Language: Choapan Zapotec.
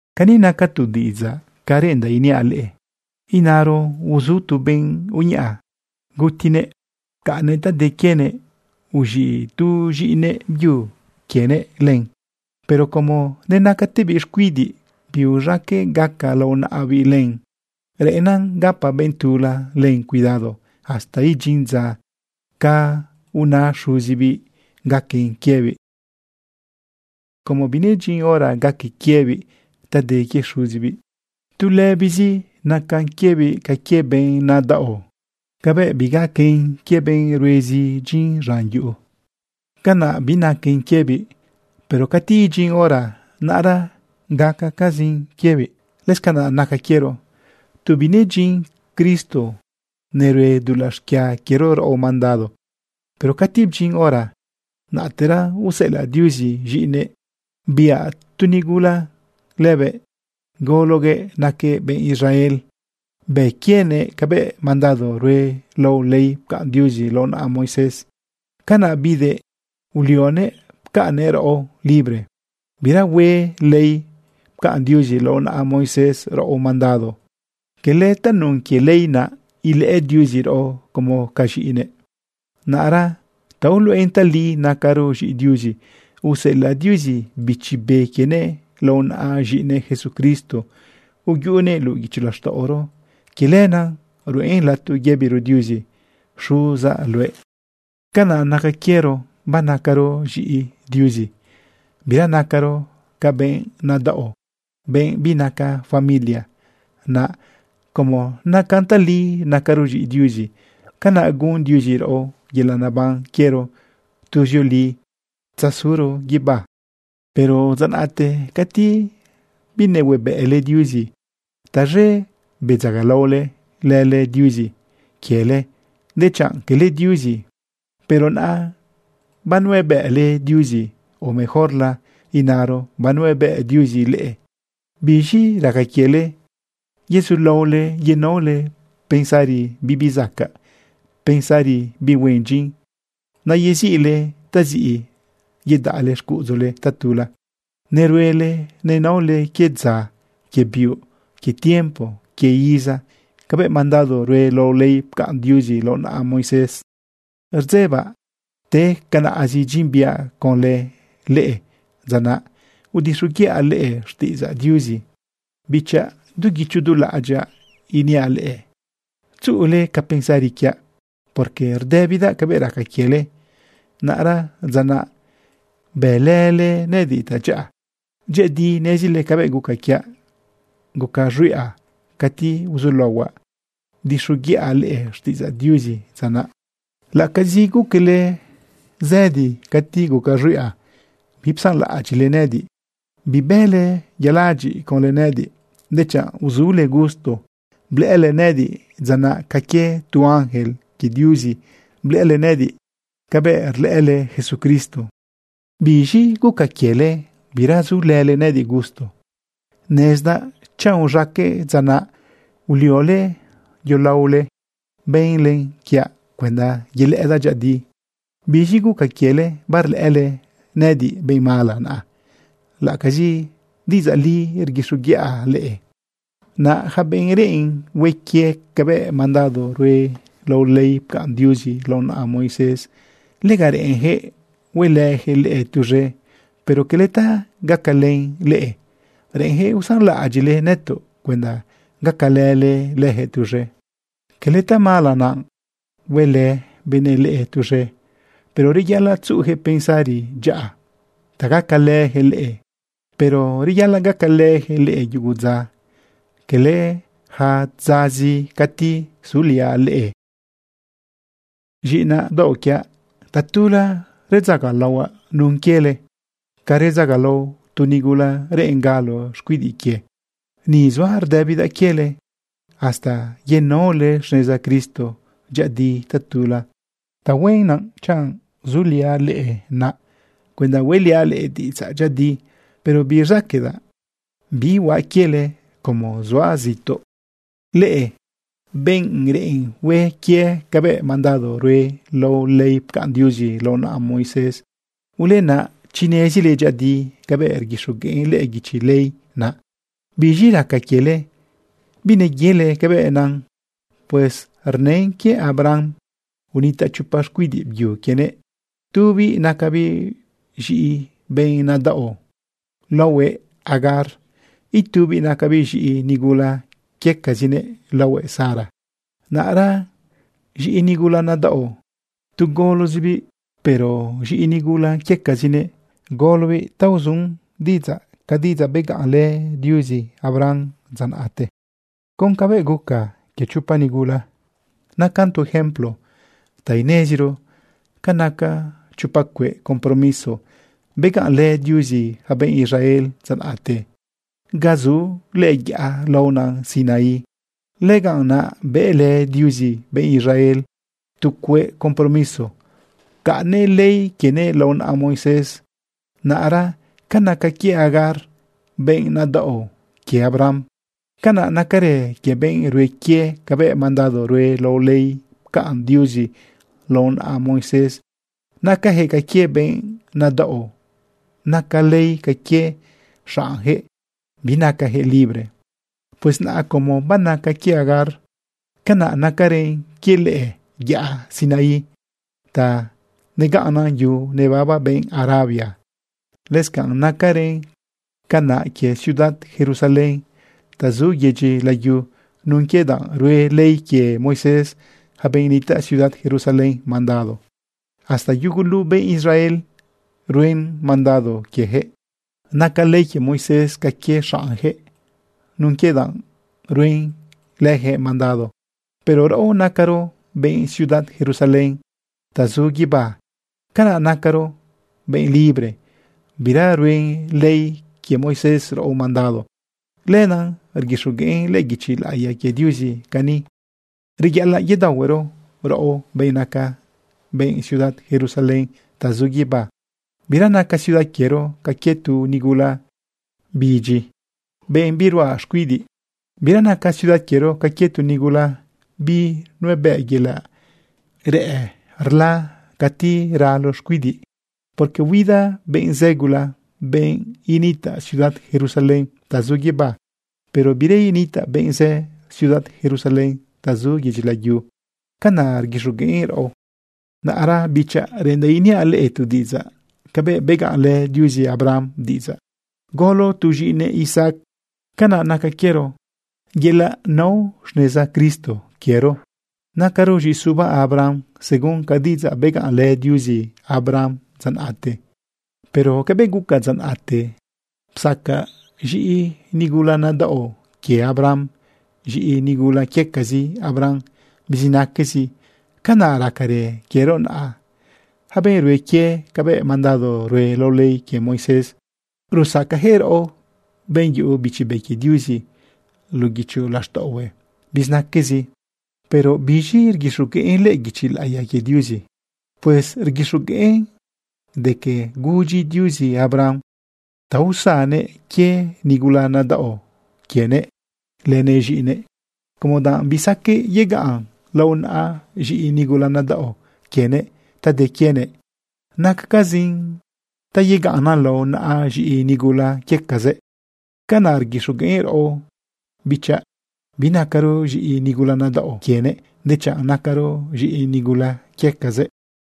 Cani naca tu diꞌidzaꞌ ca reꞌendaꞌ iniaꞌ leꞌe: Inaro uzu tu benꞌ uñaꞌa. Gutiguëꞌ pcaꞌnnëꞌ ta de quienëꞌ, uz̃iꞌ tu z̃iꞌinëꞌ byu quienëꞌ len. Pero como nenacatebiꞌ xcuidiꞌ, biuz̃aqueꞌ gaca lao naꞌabiꞌ len. Reꞌennan gapa benꞌ tula len cuidado hasta idyin dza ca una xuzibiꞌ gaquen quiebiꞌ. Como binedyin hora gaque quiebiꞌ ta de quie xuzibiꞌ, tu lëbizi nacan quiebiꞌ ca quie benꞌ nadaꞌo. Cabëꞌ bigaquen quie benꞌ ruezi dyin z̃an yuꞌu, canaꞌ binaquen quiebiꞌ. Pero cati idyin hora, naꞌra gaquecazin quiebiꞌ. Lëscanaꞌ naca quiero. Tu binedyin Cristo nerue dulaꞌ xquia quiero raꞌo mandado. Pero cati bdyin hora, naꞌtera useꞌelaꞌ Diuzi z̃iꞌinëꞌ. Biꞌa tu nigula lëbëꞌ, gologuëꞌ naquëꞌ benꞌ Israel, bë quienëꞌ cabëꞌ mandado rue lao ley pcaꞌn Diuzi lao naꞌa Moisés. Canaꞌ bidëꞌ ulionëꞌ pcaꞌnnëꞌ raꞌo libre. Bira hue ley pcaꞌn Diuzi lao naꞌa Moisés raꞌo mandado. Cala tanun quie ley naꞌ ilëꞌë Diuzi raꞌo como ca z̃iꞌinëꞌ. Naꞌra ta uluꞌen tali nacaro z̃iꞌi Diuzi, useꞌelaꞌ Diuzi Bichi Be quienëꞌ lao naꞌa z̃iꞌinëꞌ Jesucristo, uyuꞌunëꞌ luꞌu guicho laxtaꞌoro. Quie lenaꞌ ruꞌen lato yëbiro Diuzi: “Xuzaꞌ luëꞌ.” Canaꞌ naca quiero. Banacaro z̃iꞌi Diuzi, bira nacaro ca benꞌ nadaꞌo, benꞌ binaca familia. Naꞌ como nacan tali nacaro z̃iꞌi Diuzi, canaꞌ gun Diuzi raꞌo yelaꞌ neban quiero tuzioli tzazuro guibá. Pero dza naꞌte cati binehuebëꞌle Diuzi, taz̃e bedzagalaole lële diuzi quiele dechanꞌ cala diuzi. Pero naꞌa banuebëꞌle Diuzi (o mejorla inaro banuebëꞌ Diuzi leꞌe), ¿biz̃i raca quiele yezulaole yenaole pensari bibizacaꞌ, pensari bihue dyin, naꞌ yeziꞌle taziꞌ yudaꞌ xcuꞌudzule tatula? Neruele nenaole quie dza, quie biuꞌ, quie tiempo, quie iza, cabëꞌ mandado rue lao ley pcaꞌn Diuzi laꞌo naꞌa Moisés. Rdzebaꞌ te canaꞌzi dyin biaꞌ conlë leꞌe dza naꞌ udixoguiꞌa leꞌe xtiꞌidzaꞌ Diuzi. Bichaꞌ, du guicho du laꞌadyaꞌ iniaꞌ leꞌe: Tzuꞌule ca pensari quiaꞌ, porque rdëbidaꞌ cabëꞌ raca quiele. Naꞌra dza naꞌ bëlële nëꞌëdiꞌ tadyaꞌa. Dyëꞌëdi nezile cabëꞌ guca quiaꞌ guca z̃huiꞌa cati uzulaohuaꞌ udixoguiꞌa leꞌe xtiꞌidzaꞌ Diuzi dza naꞌ. Laꞌacazi guquele zëdi cati guca z̃huiꞌa, bipsanlaꞌadyiꞌle nëꞌëdiꞌ, bibële yaladyiꞌ conlë nëꞌëdiꞌ. Dechanꞌ uzule gusto, blëꞌële nëꞌëdiꞌ dza naꞌ ca quie tu ángel quie Diuzi, blëꞌële nëꞌëdiꞌ cabëꞌ rlëꞌële Jesucristo. ¿Biz̃i guca quiele, bira zulële nëꞌëdiꞌ gusto? Nezdaꞌ chanꞌ uz̃aqueꞌ dza naꞌ, uliole yolaole bënle quiaꞌ cuenda yelëꞌëdaꞌ dyëꞌëdi. ¿Biz̃i guca quiele barlëꞌële nëꞌëdiꞌ benꞌ mala naꞌa, laꞌacazi diꞌidzaꞌ li rguixoguiꞌa leꞌe? Naꞌ yaca benꞌ reꞌen hue quie cabëꞌ mandado rue lao ley pcaꞌn Diuzi lao naꞌa Moisés, lega reꞌenyaquëꞌ huelëyaquëꞌ leꞌe tuz̃e, pero cala ta gacalën leꞌe. Reꞌenjëꞌ usanlaꞌadyiꞌle nëtoꞌ cuenda gacalële leyaquëꞌ tuz̃e. Quele tamala naꞌ huelë benëꞌ leꞌe tuz̃e, pero reyaꞌalaꞌ tzuꞌuyaquëꞌ pensari dyaꞌa ta gacalëyaquëꞌ leꞌe. Pero reyaꞌalaꞌ gacalëjëꞌ leꞌe yugu dza, cala yaca dzazi cati zuliaꞌ leꞌe. Z̃iꞌinaꞌ daoꞌ quiaꞌ, tatula redzagalaohuaꞌ nun quiele ca redzagalao tu nigula reꞌen galo xcuidiꞌ quie. Ni zuaꞌ rdëbidaꞌ quiele hasta yenaole xneza Cristo dyëꞌëdi tatula. Tahuen naꞌ chanꞌ zuliaꞌ leꞌe naꞌa cuenda hueꞌliaꞌ leꞌe diꞌidzaꞌ dyëꞌëdi, pero birzaqueꞌdaꞌ bihuaꞌ quiele como zuaꞌ zituꞌ. Leꞌe benꞌ reꞌen hue quie cabëꞌ mandado rue lao ley pcaꞌn Diuzi lao naꞌa Moisés, ulena chi nezile dyëꞌëdi cabëꞌ rguixogueꞌn lëꞌë guichi ley naꞌ. ¿Biz̃i raca quiele bineyele cabëꞌ nan? Pues rnën quie Abraham unitaꞌ chopa xcuidiꞌ byu quienëꞌ. Tubiꞌ nacabiꞌ z̃iꞌi benꞌ nadaꞌo laohuëꞌ Agar. Itubiꞌ nacabiꞌ z̃iꞌi nigula quiecazinëꞌ laohuëꞌ Sara. Naꞌra z̃iꞌi nigula nadaꞌo, tu golozibiꞌ. Pero z̃iꞌi nigula quiecazinëꞌ, golobiꞌ ta uzu diꞌidzaꞌ ca diꞌidzaꞌ begaꞌnlë Diuzi Abraham dza naꞌte. Con cabëꞌ guca quie chopa nigula, nacan tu ejemplo ta ineziro ca naca chopa cueꞌ compromiso begaꞌnlë Diuzi yaca benꞌ Israel dza naꞌte. Ga zu lëꞌë yaꞌa laona Sinaí, lëganꞌ naꞌ bëlë Diuzi benꞌ Israel tu cueꞌ compromiso, pcaꞌnnëꞌ ley quienëꞌ lao naꞌa Moisés. Naꞌra ca naca quie Agar, benꞌ nadaꞌo quie Abraham, canaꞌ nacarë quie benꞌ rue quie cabëꞌ mandado rue lao ley pcaꞌn Diuzi lao naꞌa Moisés. Nacajëꞌ ca quie benꞌ nadaꞌo, naca ley ca quie xaꞌnjëꞌ, binacajëꞌ libre. Pues naꞌ como banaca quie Agar, canaꞌ nacarën quie lëꞌë yaꞌa Sinaí ta negaꞌnnan yu nebaba benꞌ Arabia. Lëscanꞌ nacarën canaꞌ quie ciudad Jerusalén ta zu yedyi layu nun quie danꞌ rue ley quie Moisés yaca benꞌ nitaꞌ ciudad Jerusalén mandado. Hasta yugulu benꞌ Israel ruen mandado quieyaquëꞌ. Naca ley quie Moisés ca quie xaꞌnyaquëꞌ nun quie danꞌ ruen quieyaquëꞌ mandado. Pero raꞌo nacaro benꞌ ciudad Jerusalén ta zu guibá. Canaꞌ nacaro benꞌ libre bira ruen ley quie Moisés raꞌo mandado. Lenaꞌ rguixogueꞌn lëꞌë guichi laꞌiya quie Diuzi cani: Reyaꞌalaꞌ yedaohuero raꞌo benꞌ naca benꞌ ciudad Jerusalén ta zu guibá. Bira naca ciudad quiero ca quie tu nigula huidyiꞌ, benꞌ biruꞌa xcuidiꞌ. Bira naca ciudad quiero ca quie tu nigula binuebëꞌ yelaꞌ re rla cati ralo xcuidiꞌ. Porque huida benꞌ zë gula, benꞌ initaꞌ ciudad Jerusalén ta zu guibá. Pero bira initaꞌ benꞌ zë ciudad Jerusalén ta zu yedyi layu. Canaꞌ rguixogueꞌn raꞌo. Naꞌra, bichaꞌ, reꞌendaꞌ iniaꞌ leꞌe tu diꞌidzaꞌ: Cabëꞌ begaꞌnlë Diuzi Abraham diꞌidzaꞌ golo tu z̃iꞌinëꞌ Isaac, canaꞌ naca quiero. Yelaꞌ nao xneza Cristo quiero nacaro z̃iꞌisuba Abraham según ca diꞌidzaꞌ begaꞌnlë Diuzi Abraham dza naꞌte. Pero cabëꞌ guca dza naꞌte, psaca z̃iꞌi nigula nadaꞌo quie Abraham z̃iꞌi nigula quiecazi Abraham bizinaquezi, canaꞌ racarë quiero naꞌa. Yaca benꞌ rue quie cabëꞌ mandado rue lao ley quie Moisés, rusacajëꞌ raꞌo, benꞌ yuꞌu Bichi Be quie Diuzi luꞌu guicho laxtaꞌohue, bizinaquezi. Pero ¿biz̃i rguixogueꞌn lëꞌë guichi laꞌiya quie Diuzi? Pues rguixogueꞌn de que gudyi Diuzi Abraham ta usannëꞌ quie nigula nadaꞌo quienëꞌ lënëꞌ z̃iꞌinëꞌ, como danꞌ bisaqueꞌ yegaꞌn lao naꞌa z̃iꞌi nigula nadaꞌo quienëꞌ ta de quienëꞌ. Nacacazin ta yegaꞌnnan lao naꞌa z̃iꞌi nigula quiecazëꞌ. Canaꞌ rguixogueꞌn raꞌo, bichaꞌ. Binacaro z̃iꞌi nigula nadaꞌo quienëꞌ, dechanꞌ nacaro z̃iꞌi nigula quiecazëꞌ.